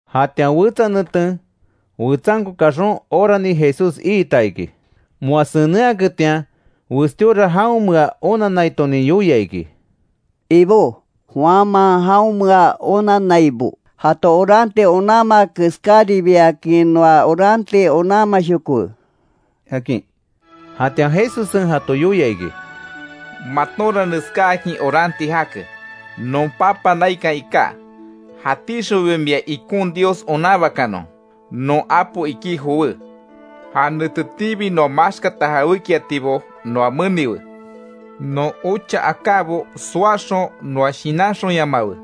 Jatian wetsa neten, wetsanko kaxon orani Jesús iita iki. Moa senenhaketian westíora jaonmea onanaiton yoia iki: —Ibó, Juanman jaonmea onannaibo jato oranti onanmaa keskáribiakin noa oranti onanmashokowe —akin. Jatian Jesussen jato yoia iki: —Matonra neskáakin oranti jake: ‘Non Papa naikan iká, jatíxonbi mia ikon Dios onanbakanon; non apo iki jowé. Ja netetiibi noa maxkata jawékiatibo noa meniwe. Non ocha akábo soaxon noa shinanxonyamawe,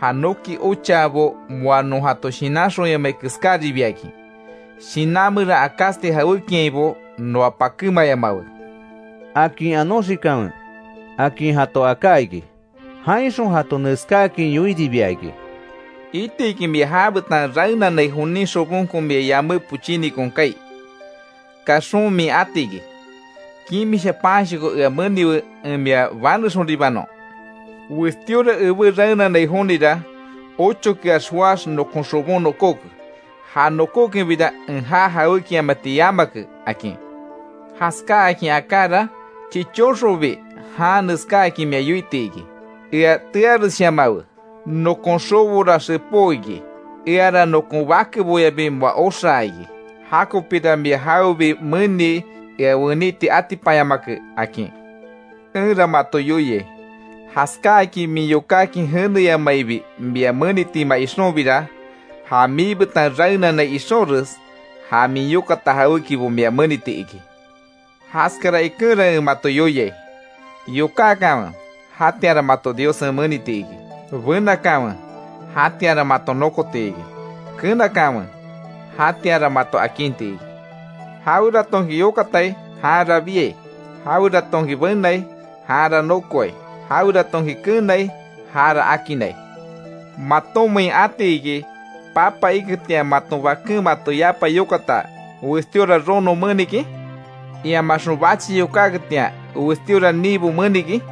ja noki ochaabo moa non jato shinanxonyamai keskáribiakin. Shinan meran akásti jawékiainbo noa pakémayamawe’, akin anonxikanwe —akin jato aká iki. Jainxon jato neskáakin yoiribia iki: —Iti iki mia já betan raenanai jonin xobonko mia yamé pochínikon kaai. Kaxon min ati iki: ‘Kimisha panshoko ea meniwe, en mia banexonribanon. Westíora ebé raenanai jonira, ochokeax joáx nokon xobon nokóke, ja nokókenbira en ja jawékiamati yamake’, akin. Jaskáakin akára, chichóxonbi jan neskáakin mia yoiti iki: ‘Ea tearesshayamawe, nokon xobora xepó iki. Eara nokon bakeboyabi moa oxaa iki. Jakopira mia jawebi menii ea weiti atipanyamake’, akin. Enra mato yoiai, jaskáakin min yokákin jeneyamaibi mia menitima ixonbira, ja miibetan raenanai ixonres, ja min yokata jawékibo mia meniti iki. Jaskara ikenra en mato yoiai: Yokákanwe jatianra mato Diossen meniti iki; benakanwe jatianra maton nokoti iki, kenakanwe jatianra mato akinti iki. Jaweratonki yokatai janra biai, jaweratonki benai janra nokoai, jaweratonki kenai jara akinnai. ¿Matonmein ati iki, papa iketian, maton baken mato yapa yokata, westíora rono menikin? Iamaxon bachi yokáketian, westíora ninbo menikin.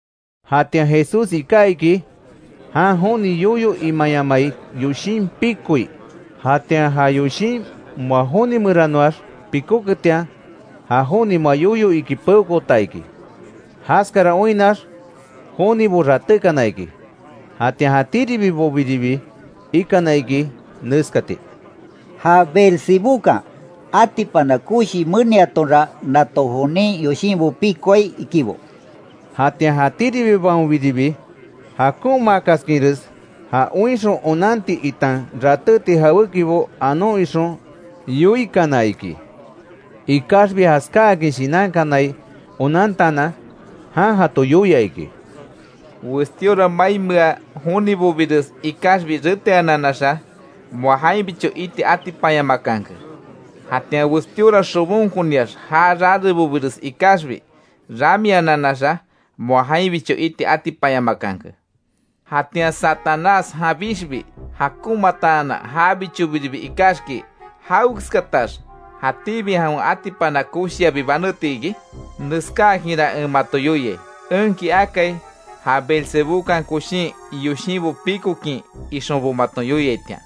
Jatian Jesús iká iki, jan joni yoyo imayamai yoshin pikoi; jatian ja yoshin moa joni meranoax pikóketian, ja joni moa yoyo iki peokoota iki. Jaskara oinnax jonibo ratékana iki. Jatian jatíribibobiribi ikana iki, neskati: “Ja Belzebúkan, atipana koshi meniatonra nato jonin yoshinbo pikoai”, ikibo. Jatian jatíribibaonbiribi, jakonmaakaskinres ja oinxon onanti, itan ratéti jawékibo anon ixon yoikana iki. Ikaxbi jaskáakin shinankanai onantaanan, jan jato yoia iki: “Westíora mainmea jonibobires ikaxbi reteananaxa, moa jainbicho iti atipanyamakanke. Jatian westíora xobonkoniax ja rarebobires ikaxbi, ramiananaxa moa jainbicho iti atipanyamakanke. Jatian Satanás janbixbi jakonmaataanan jabichobiribi ikaxki ¿Jawekeskatax jatíbi jawen atipana koshiabi baneti iki? Neskáakinra en mato yoiai; enki akai ja Beelzebúkan koshin yoshinbo pikokin ixonbo maton yoiaitian.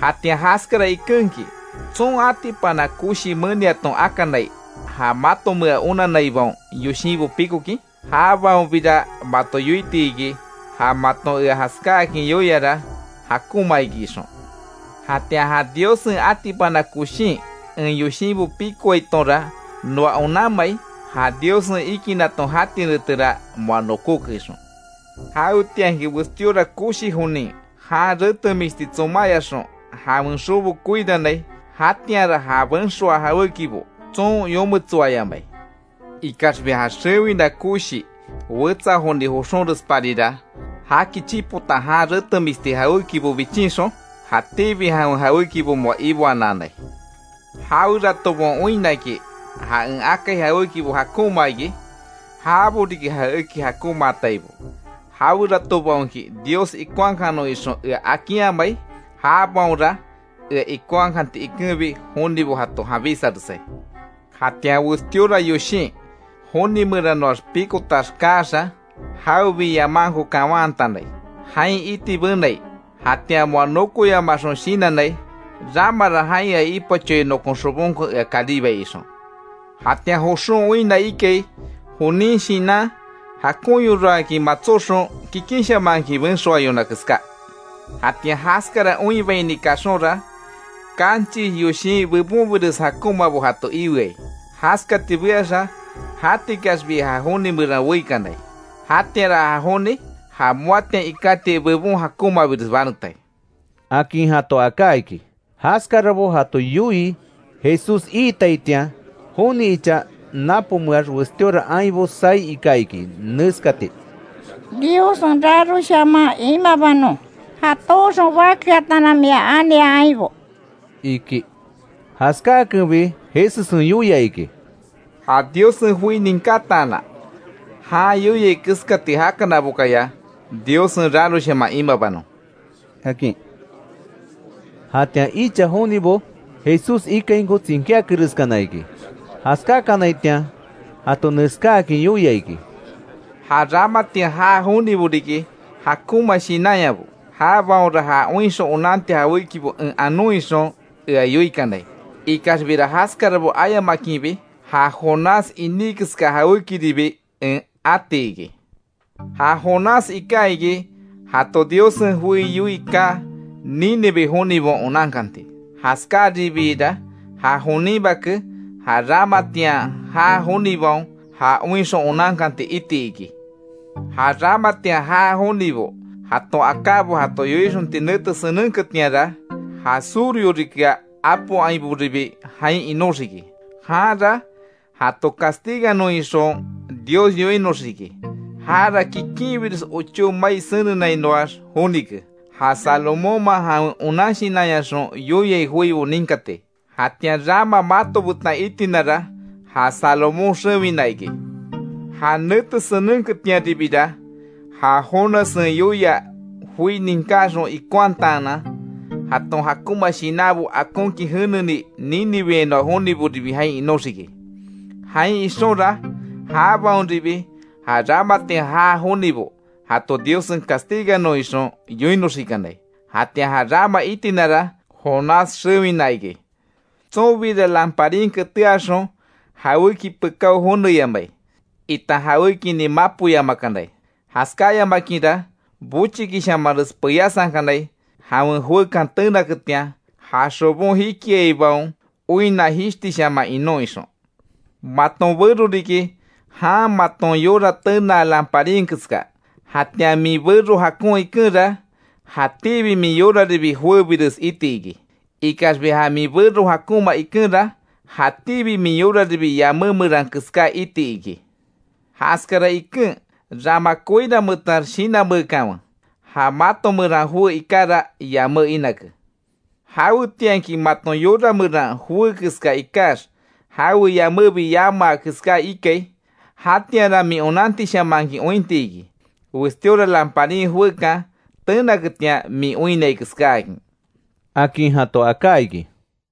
Jatian jaskara ikenki ¿Tson atipana koshi meniaton akanai, ja matomea onanaibaon yoshinbo pikokin? Jabaonbira mato yoiti iki, ja maton ea jaskáakin yoiara jakonma iki ixon. Jatian ja Diossen atipana koshin, en yoshinbo pikoaitonra noa onanmai, ja Diossen ikinaton jati netera moa nokóke ixon. Jawetianki westíora koshi jonin, jan retemisti tsomáyaxon jawen xobo koirannai, jatianra ja benxoa jawékibo tson yometsoayamai. Ikaxbi ja xewina koshi wetsa joni joxónresparira, jaki chipota jan retemisti jawékibo bichinxon, jatíbi jawen jawékibo moa iboananai. Jaweratobaon oinnaki ja en akai jawékibo jakonma iki; jabo riki ja eki jakonmaataibo, jaweratobaonki, Dios ikonhakanon ixon ea akinhamai, jabaonra ea ikonhakanti ikenbi jonibo jato janbísaresai. Jatian westíora yoshin, joni meranoax pikotax kaaxa, jawebi yamankobo kawantanai, jain iti benai. Jatian moa nokoyamaxon shinannai: ‘Ramara jain ea ipachoai nokon xobonko ea karibai’, ixon. Jatian joxon oinna ikai, jonin shinan jakonyoraakin matsóxon kikinshamanhakin benxoayona keská. Jatian jaskara oinbaini kaxonra, kanchis yoshin bebonbires jakonmabo jato iweai. Jaskati beaxa jatikaxbi ja joni meran weíkanai. Jatianra ja joni, ja moatian ikátiai bebon jakonmabires banetai”, akin jato aká iki. Jaskarabo jato yoii Jesús iitaitian, joni icha napomeax, westíora ainbo saí ika iki, neskati: —¡Diossen raroshaman imabanon, ja tooxon bakeataanan mia ania ainbo! —iki. Jaskáakenbi Jesussen yoia iki: —¡Ja Diossen joi ninkátaanan, jan yoiai keskati jakanabokaya, Diossen raroshaman imabanon! —akin. Jatian icha jonibo, Jesús ikainko tsinkíakereskana iki. Jaskákanaitian jato neskáakin yoia iki: “Ja ramatian jaa jonibo riki jakonma shinanyabo. Jabaonra ja oinxon onanti jawékibo en anon ixon ea yoikanai. Ikaxbira jaskarabo ayamakinbi ja Jonás iní keska jawékiribi en ati iki. Ja Jonás iká iki, jato Diossen joi yoii kaa, Nínive jonibaon onankanti. Jaskáribiira ja jonin Bake, ja ramatian jaa jonibaon ja oinxon onankanti iti iki. Ja ramatian jaa jonibo jaton akábo jato yoixonti nete senenketianra; ja surhorikea apo ainboribi jain inóxiki, janra jato castiganon ixon Dios yoinoxiki. Jara kikinbires ochó mai senenainoax jonike. Ja Salomónman jawen onan shinanyaxon yoiai joibo ninkati. Jatian rama mato betan itinara ja Salomón xewina iki. Ja nete senenketianribira, ja Jonassen yoia joi ninkáxon ikonhataanan, jaton jakonma shinanbo akonkin jeneni, Níniveainoa joniboribi, jain inóxiki. Jain ixonra jabaonribi, ja ramatian jaa jonibo jato Diossen castiganon ixon yoinoxikanai. Jatian ja rama itinara Jonás xewina iki. Tsonbira lamparin keteaxon jawéki pekáo joneyamai, itan jawékinin mapoyamakanai. Jaskáyamakinra bochikishamanres peyasankanai, jawen joekan tenaketian, ja xobon jikiaibaon oinna jishtishaman inon ixon. Maton bero riki, jan maton yora tenaa lamparin keska, jatian min bero jakon ikenra, jatíbi min yoraribi joébires iti iki. Ikaxbi ja min bero jakonma ikenra, jatíbi min yoraribi yamé meran keská iti iki. Jaskara iken rama koiranmeetax shinanmeekanwe; ja mato meran joé ikara yamé inake. Jawetianki maton yora meran joé keska ikax, jawe yamébi yamaa keská ikai, jatianra min onantishamanhakin ointiki, westíora lamparin joekan tenaketian min oinnai keskáakin”, akin jato aká iki.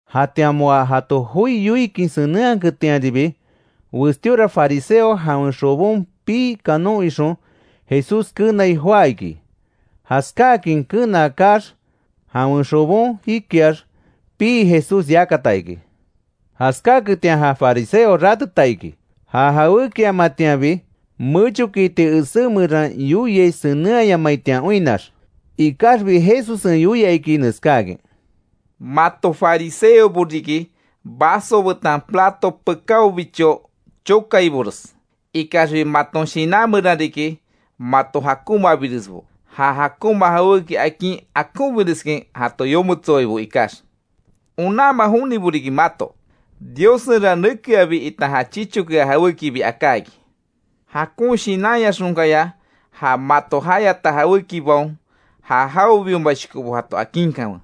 Jatian moa jato joi yoikin senenhaketianribi, westíora fariseo, jawen xobon pii kanon ixon, Jesús kenai joá iki. Jaskáakin kenaa kaax jawen xobon jikiax pii Jesús yakata iki. Jaskaketian ja fariseo ráteta iki, ja jawékiamatianbi mechokiiti esé meran yoiai senenhayamaitian oinnax. Ikaxbi Jesussen yoia iki, neskáakin: —Mato fariseobo riki vaso betan plato pekáobicho chokaibores. Ikaxbi maton shinan meran riki mato jakonmabiresbo, ja jakonma jawéki akin akonbireskin jato yometsoaibo ikax. ¡Onanma jonibo riki mato! Diossenra nekeabi itan ja chichokea jawékibi aká iki. Jakon shinanyaxonkaya ja mato jayata jawékibaon ja jawebiomashokobo jato akinkanwe;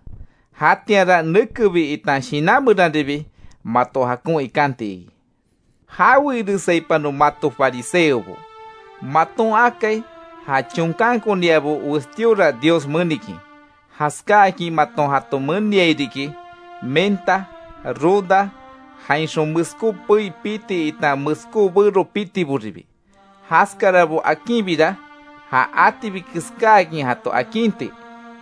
jatianra nekebi itan shinan meranribi mato jakon ikanti iki. ¡Jawe iresaipanon, mato fariseobo! Maton akai ja chonkankoniabo westíora Dios menikin. Jaskáakin maton jato meniai riki; menta, ruda jainxon meskó pei piti itan meskó bero pitiboribi. Jaskarabo akinbira ja atibi keskáakin jato akinti,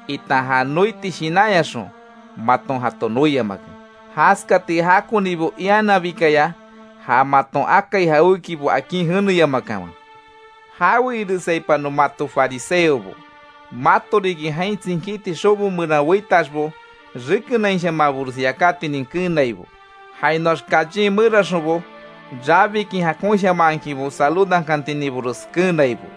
itan ja noiti shinanyaxon maton jato noiamake. Jaskati jakonibo iananbikaya ja maton akai jawékibo akin jeneyamakanwe. ¡Jawe iresaipanon, mato fariseobo! Mato riki, jain tsinkíti xobo meran weitaxbo, rekenainshamanbores yakátinin keenaibo; jainoax callen meraxonbo, rabikin jakonshamanhakinbo saludankantininbores keenaibo.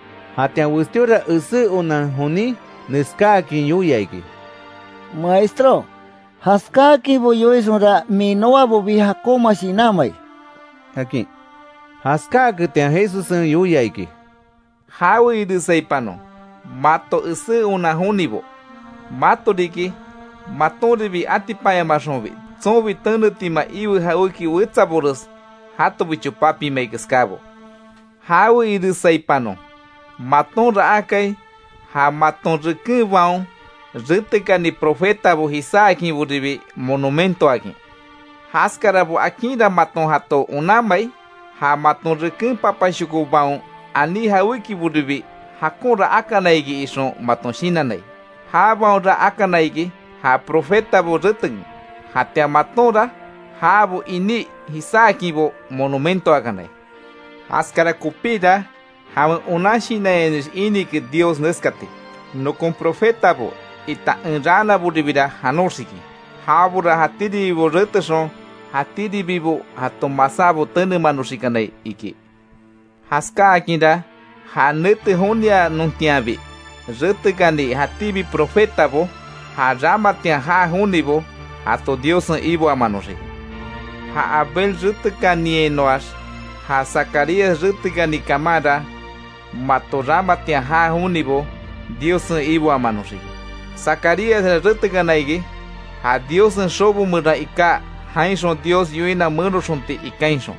Jatian westíora esé onan jonin neskáakin yoia iki: —Maestró, jaskáakinbo yoixonra min noabobi jakonma shinanmai —akin. Jaskáaketian Jesussen yoia iki: —¡Jawe iresaipanon, mato esé onan jonibo! Mato riki, matonribi atipanyamaxonbi, tsonbi tenetima iwe jawéki wetsabores jatobicho papimai keskábo. ¡Jawe iresaipanon! Matonra akai ja maton rekenbaon retekani profetabo jisáakinboribi monumentoakin. Jaskarabo akinra maton jato onanmai, ja maton reken papashokobaon aní jawékiboribi, jakonra akana iki ixon maton shinannai. Jabaonra akana iki ja profetabo retekin, jatian matonra jabo iní jisáakinbo monumentoakanai. Jaskara kopíra jawen onan shinanyanix ínike Dios neskati: ‘Nokon Profetabo itan en raanaboribira janoxiki; jabora jatíribibo retexon jatíribibo jato masábo tenemanoxikanai’, iki. Jaskáakinra ja nete jonianontianbi retekani jatíbi profetabo, ja ramatian jaa jonibo jato Diossen iboamanoxiki. Ja Abel retekaniainoax ja Zacarías retekani kamanra, mato ramatian jaa jonibo Diossen iboamanoxiki. Zacaríasra retekana iki, ja Diossen xobo meran iká jainxon Dios yoina menoxonti ikainxon.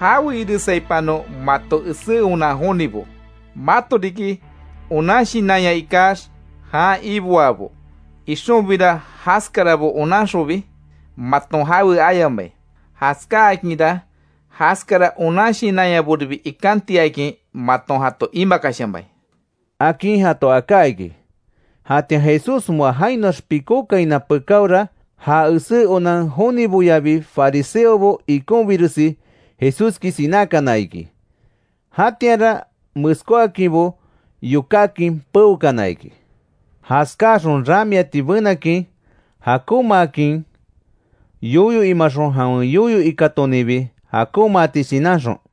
¡Jawe iresaipanon, mato esé onan jonibo! Mato riki, onan shinanya ikax jan iboabo; ixonbira jaskarabo onanxonbi maton jawe ayamai. Jaskáakinra jaskara onan shinanyaboribi ikantiakin maton jato imakashamai —akin jato aká iki. Jatian Jesús moa jainoax pikókaina pekaora, ja esé onan joniboyabi fariseobo ikonbiresi Jesúski sinákana iki. Jatianra meskóakinbo yokákin peokana iki, jaskáaxon ramiati benakin, jakonmaakin yoyo imaxon jawen yoyo ikatoninbi jakonmaati shinanxon.